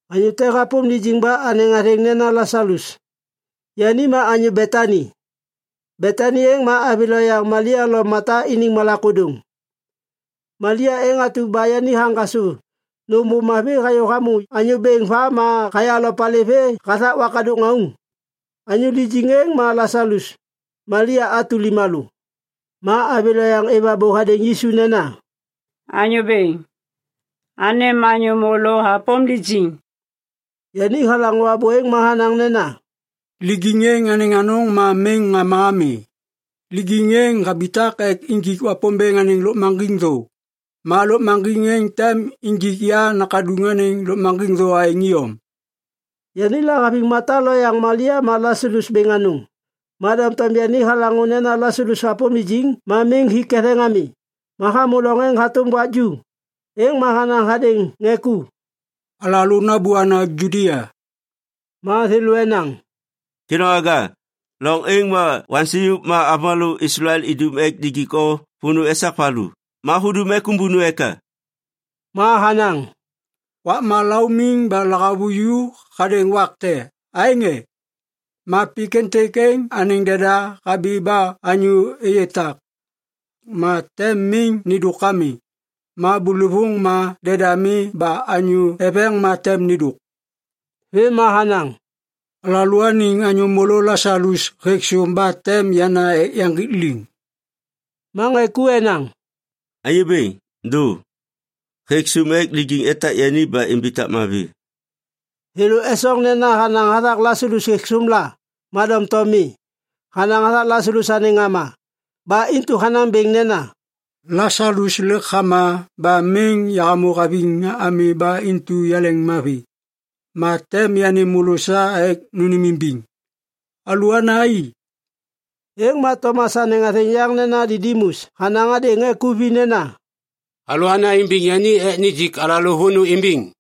Anyô te hapôm lijiŋ ba anêŋ athêŋ nena Lasalus. Yani ma anyô Betani. Betani êŋ ma avi loyaŋ Malia lo Mata iniŋ malak ôdôŋ. Malia êŋ atu ba yani haŋgasô nôm ôv mavi hayô hamô Anyô Bêŋ va ma haya lopali vê hathak wakadôk ŋauŋ. Anyô lijiŋ êŋ ma Lasalus, Malia atu limalô. Ma avi lo yaŋ êv abô hadêŋ Yisu nena, “Anyô bêŋ, anêm anyô môlô hapôm lijiŋ.” Yani halaŋô abô êŋ ma hanaŋ nena, “Lijiŋ êŋ anêŋ anôŋ ma miŋ ŋama ami. Lijiŋ êŋ habitak ek injik Wapômbêŋ anêŋ lôkmaŋgiŋ thô. Ma lôkmaŋgiŋ êŋ tem injik ya Nakaduŋ anêŋ lôkmaŋgiŋ thô aêŋ iyom.” Yani lahaviŋ Mata lo yaŋ Malia ma Lasalus bêŋ anôŋ. Ma doŋtom yani halaŋô nena Lasalus hapôm lijiŋ ma miŋ hi ketheŋ ami ma hamô loŋ êŋ hatôm wak ju. Êŋ ma hanaŋ hadêŋ ŋê ku, “Alalô nabôana Judia.” Ma thêlô enaŋ, “Kêdôŋwaga, loŋ êŋ ma waksêŋyôk ma avômalô Islael idum ek nijik o vônô esak valu! Ma hudum ek ômbônu eka?” Ma hanaŋ, “Wakma laumiŋ ba lahavuju hadêŋ wak te, aêŋ e? Ma pik êntêk êŋ anêŋ deda habi ba anyô êyê tak. Ma tem miŋ nêndôk ami. Ma bôlôvôŋ ma deda mi ba anyô eveŋ ma tem nêndôk.” Vêm ma hanaŋ, “Alalôaniŋ anyô môlô Lasalus hêk sôm ba tem yana ek yaŋgik liŋ.” Ma ŋê ku enaŋ, “Anyô Bêŋ, dô! Hêk sôm ek lijiŋ etak yani ba imbitak mavi.” Thêlô esoŋ nena hanaŋ hathak Lasalus hêk sôm la. Ma doŋtom mi. Hanaŋ hathak Lasalus anêŋ ŋama. Ba intu hanaŋ bêŋ nena, “Lasalus lêk hama ba miŋ yahamô haviŋ ami ba intu yaleŋmavi. Ma tem yanêm môlô sa ek nônêmimbiŋ. Alôana i!” Êŋ ma Tomas anêŋ athêŋ yaŋ nena Didimus hanaŋ hadêŋ ŋê ku vi nena, “Alôana imbiŋ yani ek nijik alalô vônô imbiŋ.”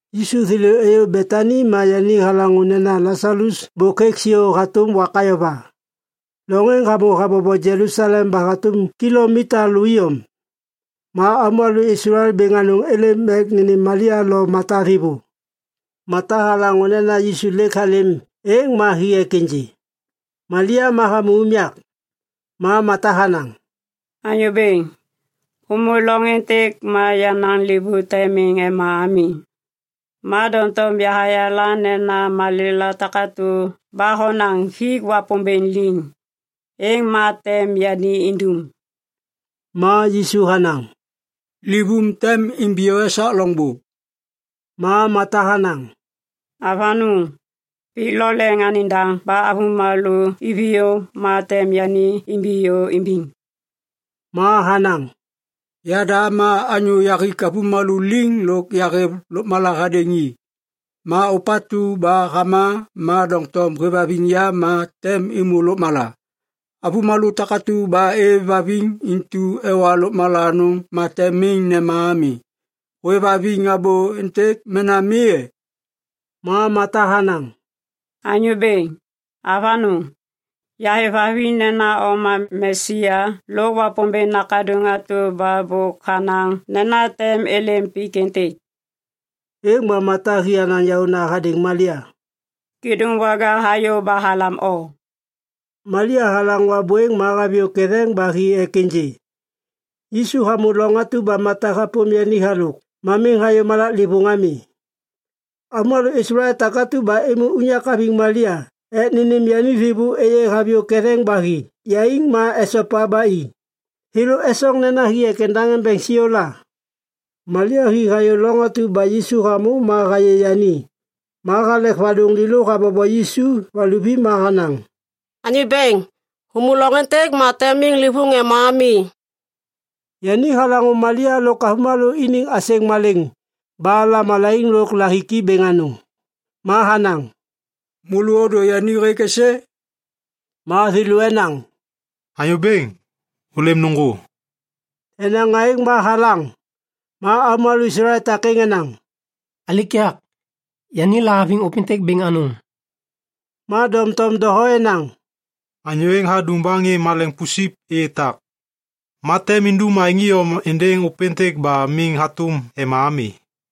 Yisu thêlô êyô Betani ma yani halaŋô nena Lasalus bôk hêk siô hatôm wak ayova. Loŋ êŋ hamô habobo Jelusalem ba hatôm kilomita lô iyom. Ma avômalô Islael bêŋ anôŋ êlêm ek nênêm Malia lo Mata thêvô. Mata halaŋô nena Yisu lêk halêm êŋ ma hi ek ênjê. Malia ma hamô unyak. Ma Mata hanaŋ, “Anyô Bêŋ, hômô loŋ êntêk ma yenaŋ livôŋ tem miŋ ema ami. Ma doŋtom yahayala nena malêla takatu ba honaŋ hik Wapômbêŋ liŋ, êŋ ma tem yani indum.” Ma Yisu hanaŋ, “Livôm tem imbiyô esak loŋbô.” Ma Mata hanaŋ, “Avanôŋ! Pik lo leŋ anêŋ daŋ ba avômalô iviyô ma tem yani imbiyô imbiŋ.” Ma hanaŋ, “Yada ma anyô yahik avômalô liŋ lôk yahêv lôkmala hadêŋ i. Ma ôpatu ba hama ma doŋtom hêvhaviŋ ya, ôpêŋ tem êmô lôkmala. Avômalô takatu ba êvhaviŋ intu ewa lôkmala anôŋ ma tem miŋ nema ami. Hôêvhaviŋ abô êntêk mena mi e?” Ma Mata hanaŋ, “Anyô Bêŋ! Avanôŋ! Yahêvhaviŋ nena o ma Mesia lôk Wapômbêŋ Nakaduŋ atu ba bôk hanaŋ nena tem êlêm pik êntêk.” Êŋ ma Mata hi hanaŋ yaôna hadêŋ Malia, “Kêdôŋwaga hayô ba halam o.” Malia halaŋô abô êŋ ma haviyô ketheŋ ba hi ek ênjê. Yisu hamô loŋ atu ba Mata hapôm yani halôk ma miŋ hayô malaklêvôŋ ami. Avômalô Islael takatu ba êmô unyak haviŋ Malia ek nênêm yani thêvô êyê haviyô ketheŋ ba hi yaiŋ ma esopa ba i. Thêlô esoŋ nena hi ek endaŋ embeŋ siô la. Malia hi hayô loŋ atu ba Yisu hamô ma hayê yani. Ma halek vadôŋ lêlô habobo Yisu valuvi ma hanaŋ, “Anyô Bêŋ, hômô loŋ êntêk ma tem miŋ livôŋ ema ami.” Yani halaŋô Malia lôk avômalô iniŋ asêŋ malêŋ ba lamalaiŋ lôk lahiki bêŋ anôŋ. Ma hanaŋ, “Môlô ôdô yani hêk êsê?” Ma thêlô enaŋ, “Anyô Bêŋ, ôlêm nôŋgô.” Enaŋ aêŋ ma halaŋ. Ma avômalô Islael takêŋ enaŋ, “Alikak! Yani lahaviŋ ôpêntêk bêŋ anôŋ.” Ma doŋtom doho enaŋ, “Anyô êŋ hadum ba ŋê maleŋiŋ pusip êyê tak. Ma tem indum aêŋ iyom êndêŋ ôpêntêk ba miŋ hatôm ema ami.”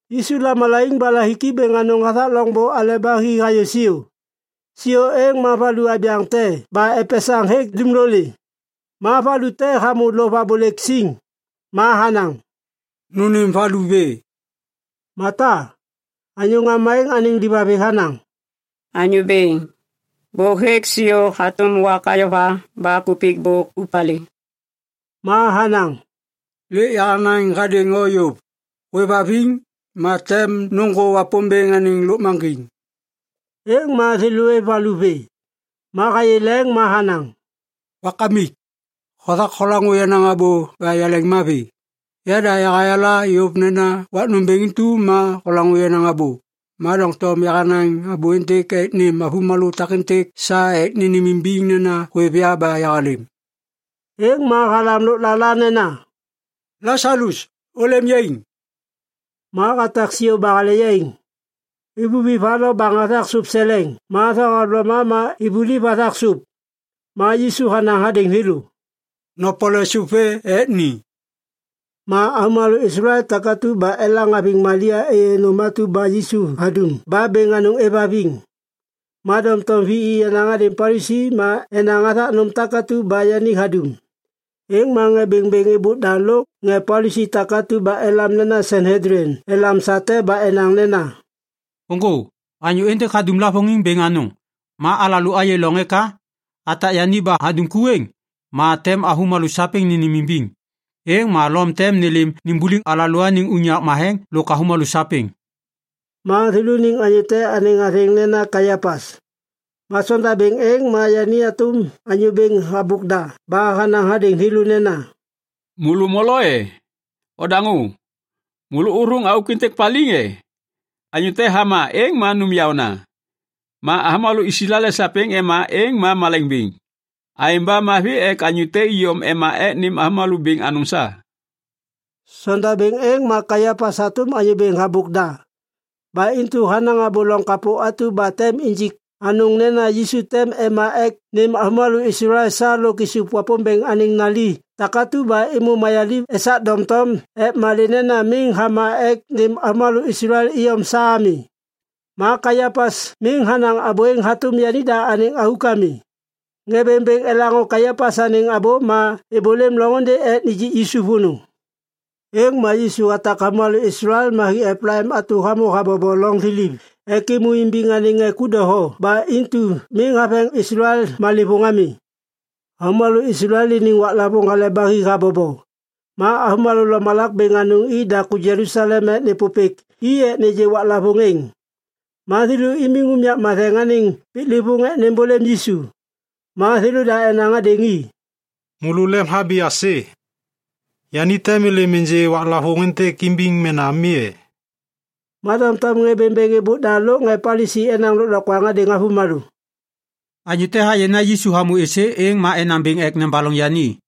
Yisu lamalaiŋ ba lahiki bêŋ anôŋ hathak loŋbô aleba hi hayô siô. Siô êŋ ma valu abyaŋ te ba epesaŋ hêk dumlolê. Ma valu te hamô lôv abôlêk siŋ. Ma hanaŋ, “Nônêm valu vê!” Mata, anyô ŋama êŋ anêŋ livavi, hanaŋ, “Anyô Bêŋ, bôk hêk siô hatôm wak ayova ba kupik bôk ôvpalê.” Ma hanaŋ, “Lêk yahanaŋ hadêŋ o yôv! Hôêvhaviŋ, ma tem nôŋgô Wapômbêŋ anêŋ lôkmaŋgiŋ.” Êŋ ma thêlô êv valu vê. Ma hayê leŋ ma hanaŋ, “Wakamik! Hothak holaŋô yenaŋ abô ba yaleŋmavi. Yada yahayala yôv nena wak nômbêŋ intu ma holaŋô yenaŋ abô. Ma doŋtom yahanaŋ abô êntêk ek nêm avômalô takêntêk sa ek nênêmimbiŋ nena hôêv ya ba yahalêm.” Êŋ ma halam lôklala nena, “Lasalus, ôlêm yaiŋ!” Ma hatak siô ba hale yaiŋ. Ivuvi va lo baŋ hathak sôp seleŋ ma thohavloma ma ivuliv hathak sôp. Ma Yisu hanaŋ hadêŋ thêlô, “Nopole sôp vê ek ni.” Ma avômalô Islael takatu ba elaŋ haviŋ Malia êyê nôm atu ba Yisu hadum ba bêŋ anôŋ êvhaviŋ. Ma doŋtom vi i hadêŋ ŋê Palisi ma enaŋ hathak nôm takatu ba yani hadum. Êŋ ma ŋê bêŋbêŋ êbôk da lôk ŋê Palisi takatu ba elam nena Sanhedlin elam sa te ba enaŋ nena, “Ôŋgô! Anyô êntêk hadum lavôŋiŋ bêŋ anôŋ. Ma alalô ayê loŋ eka? Atak yani ba hadum ku êŋ, ma tem avômalô sapêŋ nênêmimbiŋ. Êŋ ma Lom tem nêlêm nimbuliŋ alalôaniŋ unyak matheŋ lôk avômalô sapêŋ.” Ma thêlôniŋ anyô te anêŋ athêŋ nena Kaiapas. Ma sondabêŋ êŋ ma yani hatôm anyô bêŋ habôk da ba hanaŋ hadêŋ thêlô nena, “Môlô molo e? Odaŋô! Môlô ôthôŋ auk êntêk paliŋ e? Anyô te hama êŋ ma nôm yaôna. Ma avômalô Islael sapêŋ ema êŋ ma malaiŋ bêŋ. Aêŋ ba mavi ek anyô te iyom ema ek nêm avômalô bêŋ anôŋ sa.” Sondabêŋ êŋ ma Kaiapas hatôm anyô bêŋ habôk da. Ba intu hanaŋ abô loŋ kapô atu ba tem injik anôŋ nena Yisu tem ema ek nêm avômalô Islael sa lôk isup Wapômbêŋ anêŋ nali takatu ba êmô mayaliv esak doŋtom ek malê nena miŋ hama ek nêm avômalô Islael iyom sa ami. Ma Kaiapas miŋ hanaŋ abô êŋ hatôm yanida anêŋ auk ami. Ŋê bêŋbêŋ elaŋô Kaiapas anêŋ abô ma êbôlêm loŋôndê ek nijik Yisu vônô. Êŋ ma Yisu hatak avômalô Islael ma hi Eplaim atu hamô habobo loŋ thiliv ek êmô imbiŋ anêŋ ŋê ku doho ba intu miŋ haveŋ Islael malêvôŋ ami. Avômalô Islael iniŋ waklavôŋ Hale ba Hi habobo. Ma avômalô lomalak bêŋ anôŋ i daku Jelusalem ek nêpôpêk i ek nêgê waklavôŋ êŋ. Ma thêlô imiŋ unyak matheŋ anêŋ piklêvôŋ ek nêmbôlêm Yisu. Ma thêlôda enaŋ hadêŋ i, “Môlô lemhabi aisê? Yani tem êlêm ênjê waklavôŋ êntêk imbiŋ mena mi e?” Ma doŋtom ŋê bêŋbêŋ êbôk da lôk ŋê Palisi enaŋ lôklokwaŋ hadêŋ avômalô, “Anyô te hayê nena Yisu hamô êsê êŋ ma enaŋ bêŋ ek nebaloŋ yani.”